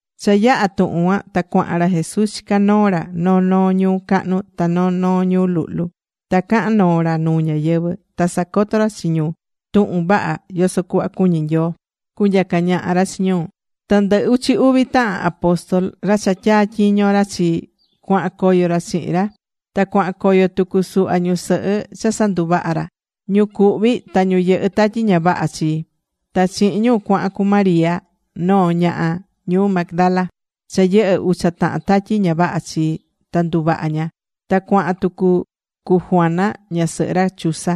Cha yaha̱ tuhun cuan, ta cuahan ra Jesús chicá noo ra noo noo ñuu cahnu ta noo noo ñuu luhlu. Ta cahan noo ra nuu ñáyɨvɨ. Ta sacoto ra chi ñu tuhun vaha yoso cuhva cuñí Nyoo cunyaca ñaha ra chi ñu. Ta ndɨ uchi uvi tahan apóstol, ra cha tyatyiño̱ ra chi, cuahan coyo ra chihin ra. Ta cuahan coyo tucu suhva ñusɨhɨ cha sanduvaha̱ ra, ñu cuhvi̱ ta ñu yɨhɨ̱ tatyi ña vaha chi. Ta chihin ñu cuahan cu María noo ñaha ñuu Magdala, cha yɨhɨ̱ ucha tahan tatyi ña vaha chi ta nduvaha̱ ña. Ta cuahan tucu cu Juana ñasɨhɨ ra Chuza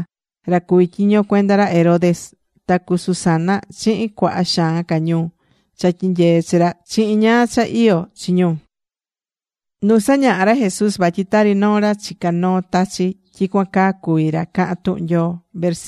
ra cuví tyiño cuenda ra Herodes, ta cu Susana chihin cuaha xaan ca ñu cha tyinyeé chi ra chihin ñáá cha iyó chi ñu.Nu sañahá ra Jesús vatyi tari noo ra chicá noo tachi̱, tyicuan caa cuví ra cahán tuhun Nyoo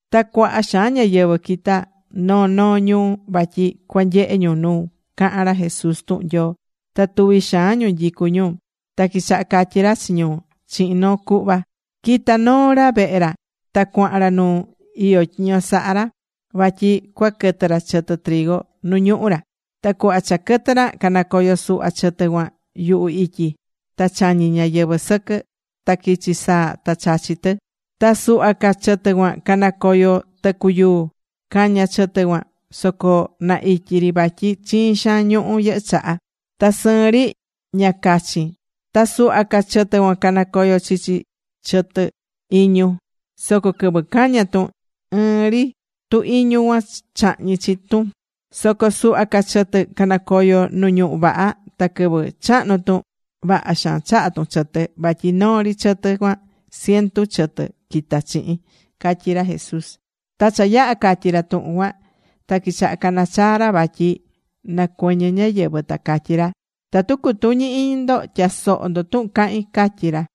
Ta cuaha xaan ñáyɨvɨ quitá noo noo ñuu, vatyi cua nyehe ñu nu cahan ra Jesús tuhun Nyoo. Ta tuvi xaan ñu nyicú ñu, ta quichaha catyi ra chi ñu chihin noo cuhva: ―Quita̱ noo ra vehe ra. Ta cuahan ra nu iyó tyiño sahá ra, vatyi cua quɨtɨ ra chɨtɨ nu ñuhú ra. Ta cuhva cha quɨtɨ ra canacoyo̱ suhva chɨtɨ cuan yuhu ityi. Ta chañi̱ ñáyɨvɨ sɨquɨ. Ta quichi̱ saa ta chachi̱ tɨ. Ta suhva ca chɨtɨ cuan canacoyo̱ tɨcu yuu. Caña̱ chɨtɨ cuan. Soco na ityi ri vatyi chiin xaan ñuhu yɨhɨ́ chaha. Ta sɨɨn ri ña cachin. Ta suhva ca chɨtɨ canacoyo̱ chichi chɨtɨ iñu, soco quɨvɨ caña̱ tun ɨɨn ri, tu iñu cuan chahñi̱ chi tun. Soco suhva ca chɨtɨ canacoyo̱ nu ñuhú vaha ta quɨvɨ chahnu tun, vaha xaan chaha̱ tun chɨtɨ. Vatyi noo ri chɨtɨ cuan, cientu chɨtɨ quita̱ chihin ―catyí ra Jesús. Ta cha yaha̱ catyí ra tuhun cuan. Ta quichaha cana chaa ra vatyi na cuɨñɨ ñáyɨvɨ, ta catyí ra: ―Tatu cutuñí iñi ndo, tya̱soho ndo tuhun cahín ―catyí ra.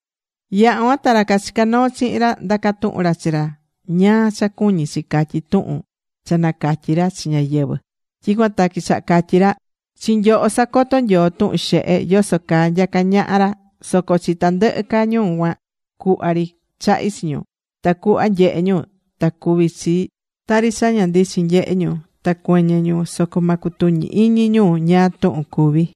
Yaha̱ cuan ta ra cachicá noo chihin ra, ndaca̱ tuhun ra chi ra ñáá cha cuñí chi catyí tuhun cha nacatyi̱ ra chi ñáyɨvɨ. Tyicuan ta quichaha catyí ra: ―Chi nyoho sacotó Nyoo tuhun xehe, yoso caa nyacá ñaha ra. Soco chi tandɨhɨ ca ñu cuan, cuhva ri chahí chi ñu. Tacuhva nyehe ñu ta cuví chi tari cha ña ndichin nyehé ñu, ta cuɨñɨ ñu soco ma cutuñi iñi ñu ñáá tuhun cuví.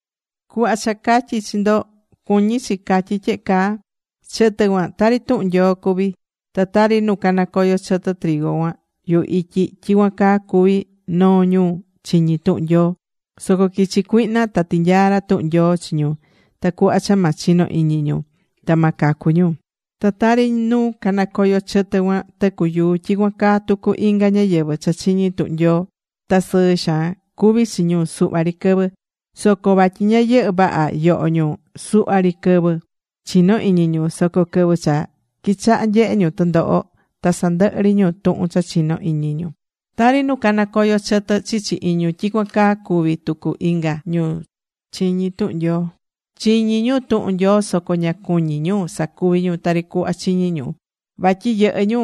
’Cuhva cha catyi̱ chi ndo, cuñí chi catyí tyehe caa: chɨtɨ cuan tari tuhun Nyoo cuví. Ta tari nu canacoyo̱ chɨtɨ cuan yuhu ityi, tyicuan caa cuví noo ñu chiñi tuhun Nyoo. Soco quichi̱ cuihna ta tinyaa̱ ra tuhun Nyoo chi ñu tacuhva cha ma chino iñi ñu. Ta ma cacu ñu. Ta tari nu canacoyo̱ chɨtɨ cuan tɨcu yuu, tyicuan caa tucu inga ñáyɨvɨ cha chiñí tuhun Nyoo. Ta sɨɨ xaan cuví chi ñu suhva ri quɨvɨ. Soco vatyi ña yɨhɨ́ vaha yoho ñu, suhva ri quɨvɨ chino̱ iñi ñu, soco quɨvɨ cha quichaha nyehe ñu tɨndoho, ta sandɨhɨ ri ñu tuhun cha chinó iñi ñu. Tari nu canacoyo̱ chɨtɨ chichi iñu, tyicuan caa cuví tucu inga ñu chiñi̱ tuhun Nyoo. Chiñí ñu tuhun Nyoo soco ña cuñí ñu sacuvi ñu tari cuhva chiñi̱ ñu. Vatyi yɨhɨ́ ñu,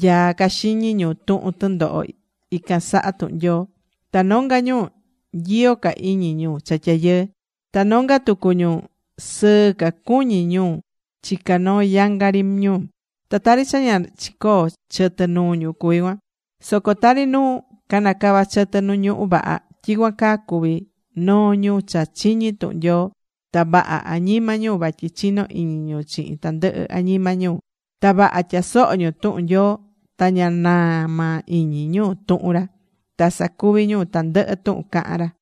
nyaá ca xiñi ñu tuhun tɨndoho ican saha tuhun Nyoo. Ta nonga ñu nyiyo ca iñi ñu cha tyayɨɨ. Ta nonga tucu ñu sɨɨ ca cuñí ñu chica noo yanga ri ñu. Ta tari cha ña chicoo chɨtɨ nuu ñu cuví cuan. Soco tari nu canacava chɨtɨ nu ñuhú vaha, tyicuan caa cuví noo ñu cha chiñí tuhun Nyoo. Ta vaha añima ñu vatyi chinó iñi ñu chihin tandɨhɨ añima ñu. Ta vaha tyasohó ñu tuhun Nyoo, ta ña naa maa iñi ñu tuhun ra. Ta sacuví ñu tandɨhɨ tuhun cahán ra.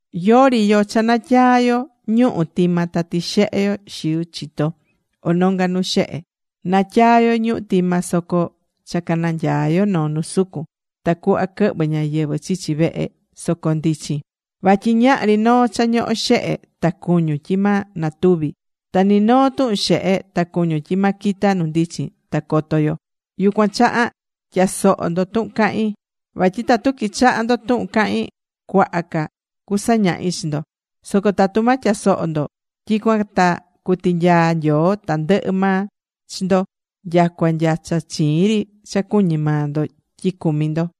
’Yori yo cha natyaa yo ñuhu̱ tima ta tixehe yo xiu chito o nonga nu xehe. Natyaa yo ñuhu̱ tima soco cha cananyaa yo noo nu sucun. Ta cuhva quɨhvɨ ñáyɨvɨ chichi vehe soco ndichin. Vatyi ñahri noo cha ñohó xehe, ta cuñún, tyi ma natuvi. Ta ni noo tuhun xehe, ta cuñun, tyi ma quita nu ndichin ta coto yo. Yucuan chaha tya̱soho ndo tuhun cahín. Vatyi tatu quichaha ndo tuhun cahín, cuaha ca cusañahi chi ndo. Soco tatu ma tyasoho ndo, tyicuan ta cutinyaa Nyoo tandɨhɨ maa chi ndo nyacua nya cha chiin ri cha cuñí maa ndo tyi cumí ndo.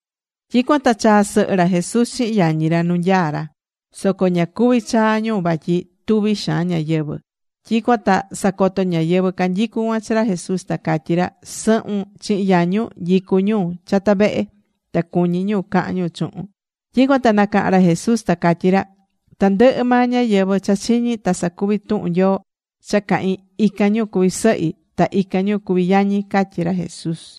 Tyicuan ta chaa̱ sɨhɨ ra Jesús chihin yañi ra nu nyaá ra. Soco ña cuvi̱ chaa ñu vatyi tuví xaan ñáyɨvɨ. Tyicuan ta sacoto ñáyɨvɨ canyicú cuan chi ra Jesús, ta catyí ñu: ―Sɨhun chihin yañun nyicú ñu chata vehe. Ta cuñí ñu cahan ñu chuhun. Tyicuan ta nacaha̱n ra Jesús, ta catyí ra: ―Tandɨhɨ maa ñáyɨvɨ cha chiñí ta sacuví tuhun Nyoo cha cahín, ican ñu cuví sɨhi, ta ican ñu cuví yañi ―catyí ra Jesús.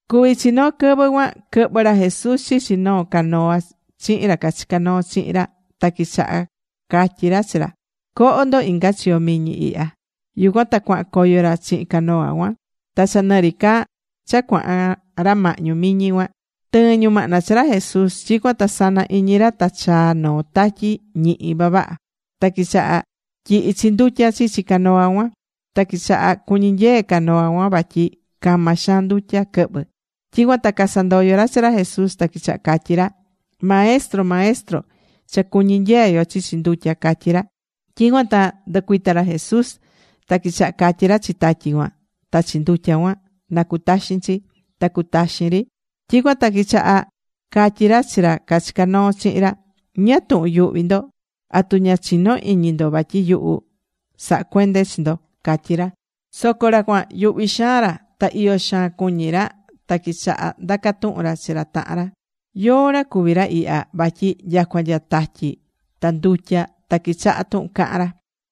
Cuví chi noo quɨvɨ cuan quɨhvɨ̱ ra Jesús chichi noo canoa chihin ra cachicá noo chihin ra. Ta quichaha catyí ra chi ra: ―Co̱ho ndo inga chiyo miñi ihya. Yucuan ta cuahan coyo ra chihin canoa cuan. Ta cha nɨ ri ca cha cuahan ra mahñu miñi cuan, tɨɨ̱n ñumahna chi ra Jesús. Tyicuan ta sana iñi ra ta chaa̱ noo tatyi ñihi vavaha. Ta quichaha tyihi chi ndutya chichi canoa cuan. Ta quichaha cuñí nyee canoa cuan vatyi cama xaan ndutya quɨhvɨ̱. Tyicuan ta casandoyo̱ ra chi ra Jesús. Ta quichaha catyi ra: ―¡Maestro! ¡Maestro! Cha cuñí nyee yo chichi ndutya ―catyí ra. Tyicuan ta nducuita̱ ra Jesús. Ta quichaha catyí ra chi tatyi cuan ta chi ndutya cuan, na cutaxin chi. Ta cutaxi̱n ri. Tyicuan ta quichaha catyí ra chi ra cachicá noo chihin ra: ―¿Ñáá tuhun yuhví ndo? ¿Atu ña chinó iñi ndo vatyi yuhu sahá cuende chi ndo? ―catyí ra. Soco ra cuan, yuhvi xaan ra. Ta iyo xaan cuñí ra. Ta quichaha ndaca tuhun ra chi ra tahan ra: ―¿Yóó ra cuví ra ihya? Vatyi nyacua nya tatyi ta ndutya ta quichahá tuhun cahán ra.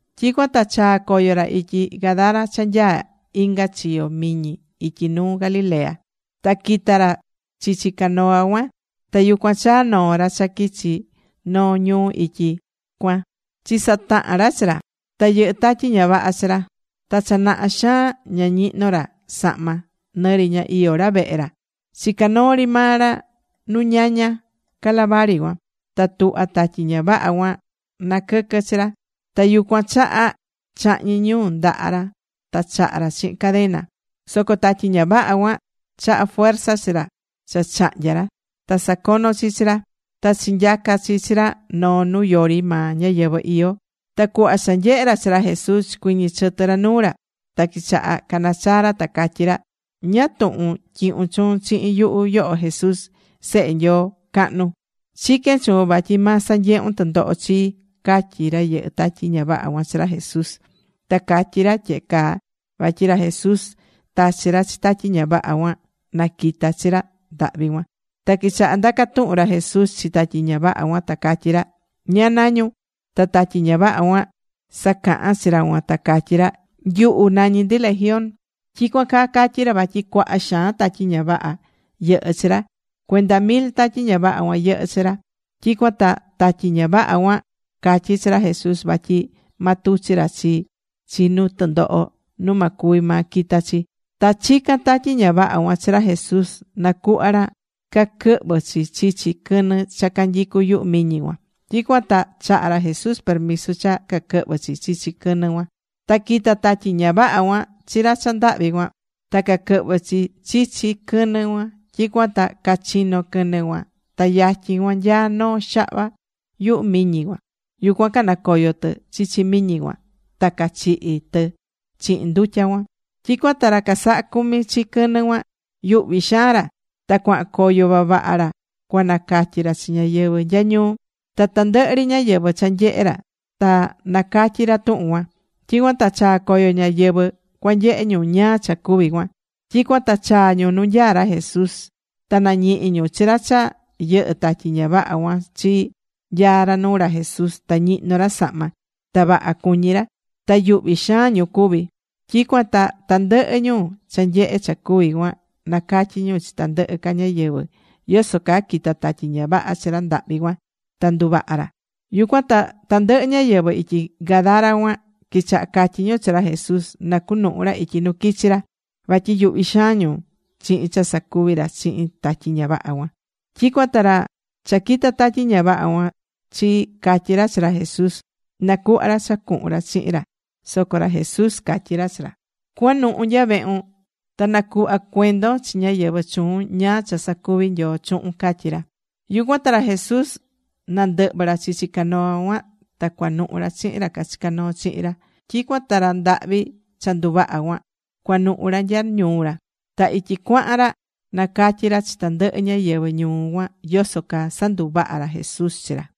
Tyicuan ta chaa̱ coyo ra ityi Gadara cha nyaá inga chiyo miñi ityi nuu Galilea. Ta quita̱ ra chichi canoa cuan. Ta yucuan chaa̱ noo ra cha quichi noo ñuu ityi cuan chisatahan ra chi ra. Ta yɨhɨ́ tatyi ña vaha chi ra. Ta cha naha xaan ña ñihnó maa ra sahma. Nɨ ri ña iyó ra vehe ra. Chicá noo ri maa ra nu ñaña calavari cuan. Ta tuhvá tatyi ña vaha cuan naquɨquɨ chi ra. Ta yucuan chaha chahñí ñu ndaha ra ta chaha ra chihin cadena. Soco tatyi ña vaha cuan chahá fuerza chi ra cha cahnya ra. Ta sacono chi chi ra. Ta chinyaca̱ chi chi ra noo nu yori maa ñáyɨvɨ iyó. Ta cuhva cha nyehe̱ ra chi ra Jesús, chicuɨñɨ̱ chɨtɨ ra nuu ra. Ta quichaha canachaa ra, ta catyí ra: ―¿Ñáá tuhun tyihún chuun chihin yuhu, yoho Jesús, Sehe Nyoo cahnu? Chiquén chuun vatyi ma sanyehun tundoho chii ―catyí ra yɨhɨ́ tatyi ña vaha cuan chi ra Jesús. Ta catyí ra tyehe caa vatyi ra Jesús tachi̱ ra chi tatyi ña vaha cuan, na quita chi ra ndahvi cuan. Ta quichaha ndaca tuhun ra Jesús chi tatyi ña vaha cuan, ta catyí ra: ―¿Ñáá nañún? Ta tatyi ña vaha cuan sacahan chi ra cuan, ta catyí ra: ―Nyuhu nañí ndi, Legión. Tyicuan caa catyí ra vatyi cuaha xaan tatyi ña vaha yɨhɨ́ chi ra. Cuenda mil tatyi ña vaha cuan yɨhɨ́ chi ra. Tyicuan ta tatyi ña vaha cuan catyí chi ra Jesús vatyi ma tuchi ra chi chi nu tɨndoho nu ma cuvi maa quita chi. Ta chicán tatyi ña vaha cuan chi ra Jesús nacuhva ra caquɨhvɨ chi chichi quɨnɨ cha canyicú yuhu miñi cuan. Tyicuan ta chaha ra Jesús permiso cha caquɨhvɨ chi chichi quɨnɨ cuan. Ta quita̱ tatyi ña vaha cuan chi ra ndahvi cuan. Ta caquɨhvɨ̱ chi chichi quɨnɨ cuan. Tyicuan ta cachino quɨnɨ cuan. Ta yatyin cuan nyaá noo xahva yuhu miñi cuan. Yucuan canacoyo̱ tɨ chichi miñi cuan. Ta cachihi tɨ chihin ndutya cuan. Tyicuan ta ra casahá cumi chi quɨnɨ cuan, yuhví xaan ra. Ta cuahan coyo vavaha ra cua nacatyi ra chi ñáyɨvɨ nya ñuu. Ta tandɨhɨ ri ñáyɨvɨ cha nyehe ra, ta nacatyi ra tuhun cuan. Tyicuan ta chaa̱ coyo ñáyɨvɨ cua nyehe ñu ñáá cha cuvi̱ cuan. Tyicuan ta chaa̱ ñu nu nyaá ra Jesús. Ta nañihi̱ ñu chi ra cha yɨhɨ̱ tatyi ña vaha cuan chi. Nyaá ra nuu ra Jesús. Ta ñihnó ra sahma ra. Ta vaha cuñí ra. Ta yuhví xaan ñu cuví. Tyicuan ta tandɨhɨ ñu cha nyehe̱ cha cuvi̱ cuan, nacatyi̱ ñu chi tandɨhɨ ca ñáyɨvɨ yoso caa quita̱ tatyi ña vaha chi ra ndahvi cuan, ta nduvaha̱ ra. Yucuan ta tandɨhɨ ñáyɨvɨ ityi Gadara cuan quichaha catyi ñu chi ra Jesús na cunuhu ra ityi nu quichi ra. Vatyi yuhví xaan ñu chihin cha sacuvi̱ ra chihin tatyi ña vaha cuan. Tyicuan ta ra cha quita̱ tatyi ña vaha cuan chi, catyi̱ ra chi ra Jesús, na cuhva ra cha cuhun ra chihin ra. Soco catyí ra Jesús chi ra: ―Cua̱nuhu nya vehun. Ta na̱cuhva cuendon chi ñáyɨvɨ chuun ñáá cha sacuvi̱ Nyoo chuhun ―catyí ra. Yucuan ta ra Jesús nandɨhvɨ̱ ra chichi canoa cuan. Ta cuanuhu ra chihin ra cachicá noo chihin ra. Tyicuan ta ra ndahvi cha nduvaha cuan, cuanuhu ra nya ñuu ra. Ta ityi cuahan ra nacatyí ra chi tandɨhɨ ñáyɨvɨ ñuu cuan yoso caa sanduvaha̱ ra Jesús chi ra.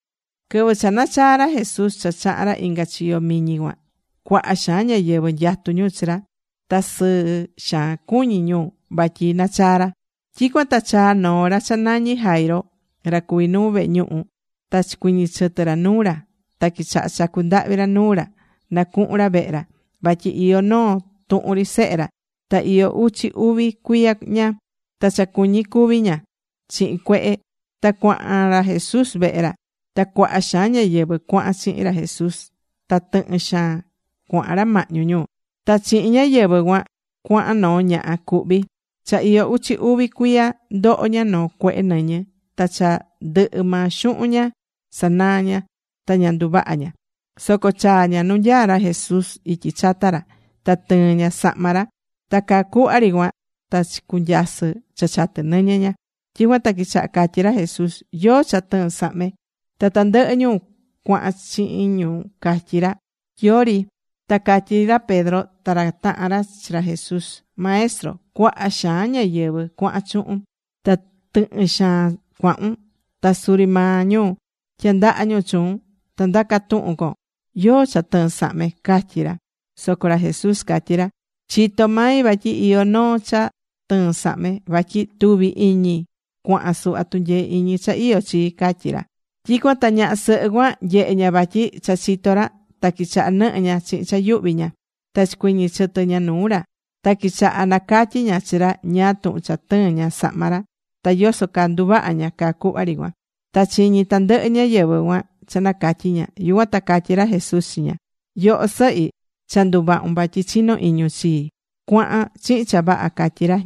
Quɨvɨ cha nachaa̱ ra Jesús cha chaha̱n ra inga chiyo miñi cuan, cuaha xaan ñáyɨvɨ nyatú ñu chi ra. Ta sɨɨ xaan cuñí ñu vatyi nachaa̱ ra. Tyicuan ta chaa̱ noo ra cha nañí Jairo, ra cuví nuu vehe ñuhu, ta chicuɨñɨ̱ chɨtɨ ra nuu ra. Ta quichaha chacu ndahvi ra nuu ra, na cuhun ra vehe ra. Vatyi iyó noo tuhun ri sehe ra, ta iyó uchi uvi cuiya ña. Ta cha cuñí cúvi ña chihin cuehe. Ta cuahan ra Jesús vehe ra. Ta cuaha xaan ñáyɨvɨ cuahan chihin ra Jesús, ta tɨhɨn xaan cuahan ra mahñu ñu. Ta chihin ñáyɨvɨ cuan cuahan noo ñaha cuhví. Cha iyó uchi uvi cuiya ndoho ña noo cuehe nɨñɨ. Ta cha ndɨhɨ maa xuhun ña sanaa̱ ña, ta ña nduvahá ña. Soco chaa̱ ña nu nyaá ra Jesús ityi chata ra. Ta tɨɨ̱n ña sahma ra. Ta caa cuhva ri cuan, ta chicunyasɨ cha chatɨ nɨñɨ ña. Tyicuan ta quichaha catyí ra Jesús: ―¿Yóó cha tɨɨ̱n sahme? Ta tandɨhɨ ñu cuahan chihin ñu catyí ra: ―Yori. Ta catyí ra Pedro ta ra tahan ra chi ra Jesús: ―Maestro, cuaha xaan ñáyɨvɨ cuahan chuhun, ta tɨhɨn xaan cuahun. Ta suri maa ñu tyandahá ñu chuun. Ta ndacá tuhun con “¿Yóó cha tɨɨ̱n sahme?” ―catyí ra. Soco ra Jesús catyí ra: ―Chitó mai vatyi iyó noo cha tɨɨ̱n sahme. Vatyi tuvi̱ iñi cuahan suhva tunyee iñi cha iyó chii ―catyí ra. Tyicuan ta ñaha sɨhɨ cuan nyehe̱ ña vatyi cha chitó ra. Ta quichaha nɨhɨ ña chihin cha yuhví ña. Ta chicuɨñɨ̱ chɨtɨ ña nuu ra. Ta quichaha nacatyí ña chi ra ñáá tuhun cha tɨɨ̱n ña sahma ra, ta yoso caa nduvaha̱ ña caa cuhva ri cuan. Ta chiñí tandɨhɨ ñáyɨvɨ cuan cha nacatyi ña. Yucuan ta catyí ra Jesús chi ña: ―Yoho sɨhi, cha nduvahu̱n vatyi chinó iñun chii. Cua̱han chihin cha vaha ―catyí ra.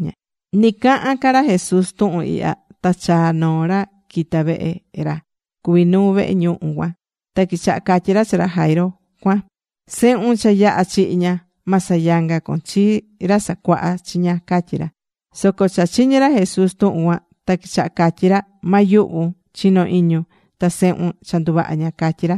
Nɨ cahán ca ra Jesús tuhun ihya, ta chaa̱ noo ra quita̱ vehe ra cuví nuu vehe ñuhu cuan. Ta quichaha catyí ra chi ra Jairo cuan: ―Sehun cha yaha̱ chihi ña. Ma sayanga con chi Ra Sacuaha chiña ―catyí ra. Soco cha chiñi̱ ra Jesús tuhun cuan. Ta quichaha catyí ra: ―Ma yuhvun. Chi̱no iñun. Ta sehun cua nduvaha ña ―catyí ra.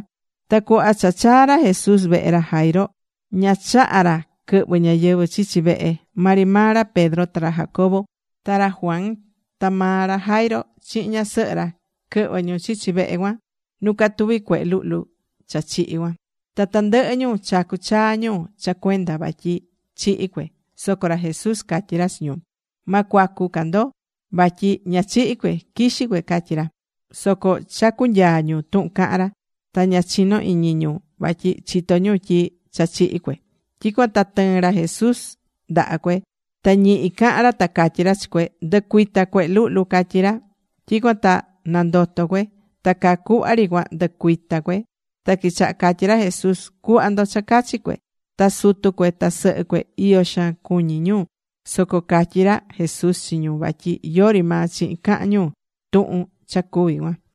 Ta cuhva cha chaa̱ ra Jesús vehe ra Jairo, ña chaha̱ ra quɨhvɨ ñáyɨvɨ chichi vehe. Maa ri maa ra Pedro ta ra Jacobo ta ra Juan ta maa ra Jairo chihin ñasɨhɨ ra, quɨhvɨ̱ ñu chichi vehe cuan nu catuví cuehe luhlu cha chihi̱ cuan. Ta tandɨhɨ ñu chacú chaa ñu cha cuenda vatyi chihi̱ cue. Soco ra Jesús catyí ra chi ñu: ―Ma cua̱cu ca ndo. Vatyi ña chihi̱ cue. Quixí cue ―catyí ra. Soco chacú nyaa ñu tuhun caha̱n ra. Ta ña chinó iñi ñu. Vatyi chitó ñu tyi cha chihi̱ cue. Tyicuan ta tɨɨ̱n ra Jesús ndaha cue. Ta ñihi cahan ra ta catyí ra chi cue: ―Ndu̱cuita, cuehe luhlu ―catyí ra. Tyicuan ta nandoto̱ cue. Ta caa cuhva ri cuan ndɨcuita̱ cue. Ta quichaha catyí ra Jesús: ―Cu̱hva ndo cha cachi cue. Ta sutu cue ta sɨhɨ cue, iyo xaan cuñí ñu. Soco catyi̱ ra Jesús chi ñu vatyi yori maa chihin cahán ñu tuhun cha cuvi̱ cuan.